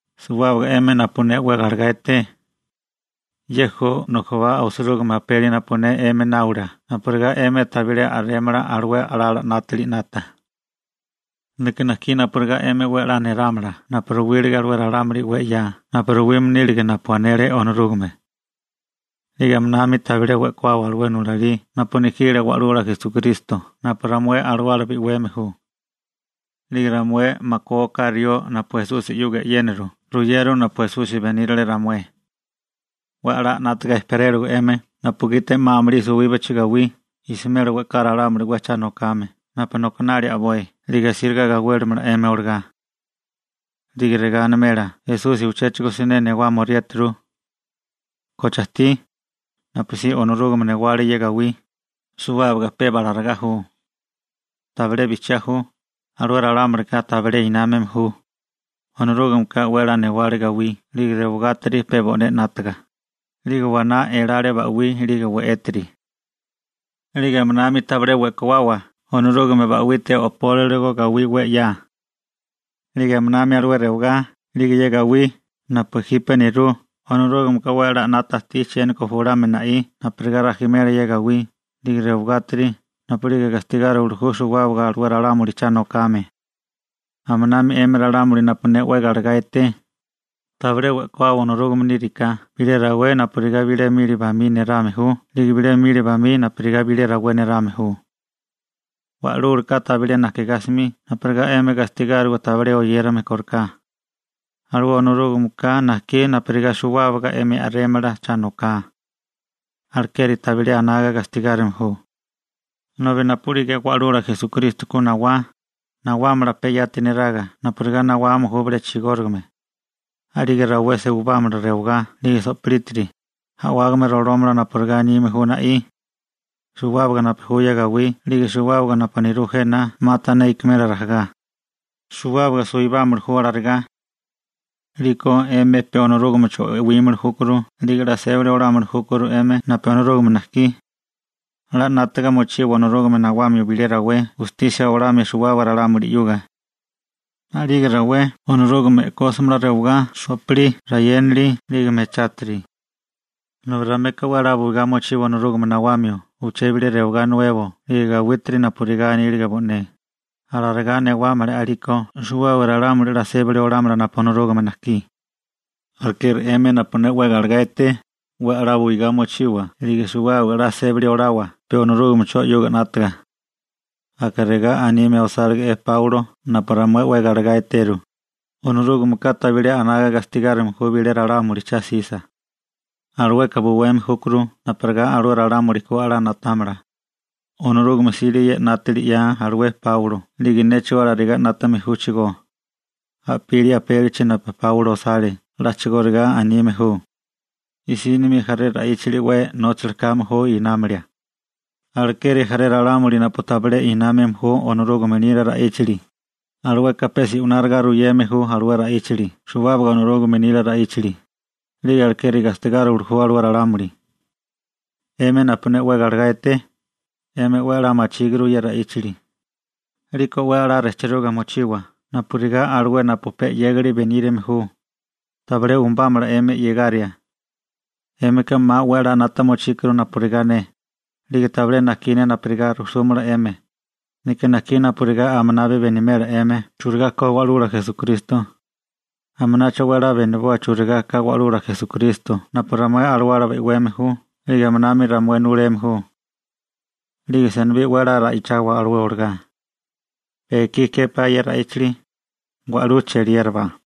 Suwábaga 'emi napu ne 'we galegá eté, ye ju nujubá osirúgime apeli napu ne 'emi náola napurigá 'emi tabilé a'rémala alué a'lala 'nátili 'nata. Neka najkí napurigá 'emi 'we 'la nélámala napu ruwílige alué ralámuli 'we 'ya napu ruwime nílige napu anele Onorúgame. 'Lige aminami tabilé we'kuawa alué nulalí napu nejile Wa'lula Esukristo napu ramué alawala bi'weme ju. 'Lige ramué makué oká rió napu Esusi 'yuga e'yéniru ruyeru napu Esusi benírale ramué. 'We a'lá 'nátaga ejperélawa 'emi napugiti 'ma amulí suwíbachi gawí jsimela we'ká ralámuli 'we cha nokame napu nokinali a'boi 'lige asíriga gawélimala 'emi olagá. 'Lige regá animela: «Esusi uchéchigo siné nawámaoriéturu. ¿Koche ajtí? Napusí Onorúgame newale ye gawí, suwábaga peba alarigá ju.» Tabilé bijchiá ju. Alué ralámulika tabilé námame ju. Onorúgmeka 'we 'ya newale gawí 'lige rewagátiri pe bo'né 'nátaga, 'lige waná elale ba'wí 'lige we'étiri. 'Lige aminami tabilé we'kuawa Onorúgame ba'wite o'pólirigo gawí 'we 'ya. 'Lige aminami alué rewagá 'lige ye gawí napu jipe nerú Onorúgameka 'we 'la 'nata ajtí chiéniko julamio na'í napurigá rajimela ye gawí 'lige rewagátiri napu'lige gastigáriwili ju suwábaga alué ralámuli cha nokame. Aminami 'emi ralámuli napu ne 'we galegá eté, tabilé we'kuawa Onorúgame níriká, bilé rawé napurigá bilé mili bamí nerame ju 'lige bilé mili bamí napurigá bilé rawé nerame ju. Wa'lúlaka tabilé najkigá 'smi napurigá 'emi gastigáriwa tabilé oyérame kóriká, alué Onorúgameka najkí napurigá suwábaga 'emi a'rémala cha noká. Alekeri tabilé anaga gastigárime ju. Nobi napu'lige Wa'lula Esukristo ku nawá, nawámala pe yati neraga napurigá nawame ju bilé chigórigame. A'lige rawé suwibámala rewagá 'lige sopilítiri, a'wágame rolómala napurigá anime ju na'í. Suwábaga napu ju ye gawí 'lige suwábaga napu nerú jena 'ma tané ikimela rajagá. Suwábaga suwibámili ju alarigá. 'Liko 'emi pe Onorúgamecho e'wímili júkuru 'lige 'la sébali olamili júkuru 'emi napu Onorúgame najkí. 'La 'nátaga mochiwa Onorúgame nawamio bilé rawé gustisia olamia suwábaga ralámuli. A'lige rawé Onorúgame e'kósimala rewagá, so'pilí, rayénali 'lige mechátiri. Nobi ramueka 'we 'la buigá mochiwa Onorúgame newamio uché bilé rewagá nuebo 'lige gawítiri napurigá anílige bo'né, alarigá newámala a'liko suwábaga ralámuli 'la sébali olámala napu Onorúgame najkí. Alekeri 'emi napu ne 'we galegá eté, 'we 'la buigá mochiwa 'lige suwábaga 'la sébali olawa pe Onorúgamecho 'yuga 'nátaga. Aka regá anime osálige'é Páulo napu ramué 'we galegá eteru: «Onorúgameka tabilé anaga gastigárime ju bilé ralámuli cha'sisa. Alueka buweme júkuru napurigá alué ralámuli ku 'la na'támala.» Onorúgame 'sile ye 'nátali 'ya alué Páulo 'lige néchigó alarigá 'nátame júchigó. A'pili apélichi napu Páulo osale a'chigóriga anime ju. I'sínimi jaré ra'íchali 'we nóchali kame ju námilia. Alekeri jaré ralámuli napu tabilé námame ju Onorúgame nila ra'íchali, alueka pe se'wináriga ruyeme ju alué ra'íchali suwábaga Onorúgame nila ra'íchali, 'lige alekeri gastigáriwili ju alué ralámuli. 'Emi napu ne 'we galegá eté, 'emi 'we 'la machíguru ye ra'íchali. 'Liko 'we 'la rejchiruga mochiwa napurigá alué napu pe 'yégali benírame ju, tabilé umbámala 'emi 'yegaria. 'Émika 'ma 'we a'lá 'nata mochíkuru napurigá ne, 'lige tabilé najkí ne napurigá rujsúmala 'emi. Neka najkí napurigá aminabi benimela 'emi churigá ko Wa'lula Esukristo. Aminacho 'we 'la beniboa churigá ka Wa'lula Esukristo napu ramué alawala bi'weme ju 'lige aminami ramué nuleme ju. 'Lige senibí 'we 'la ra'ichawa alué olagá. Pe ekí képá ye ra'íchali. Wa'lú cheliérabá.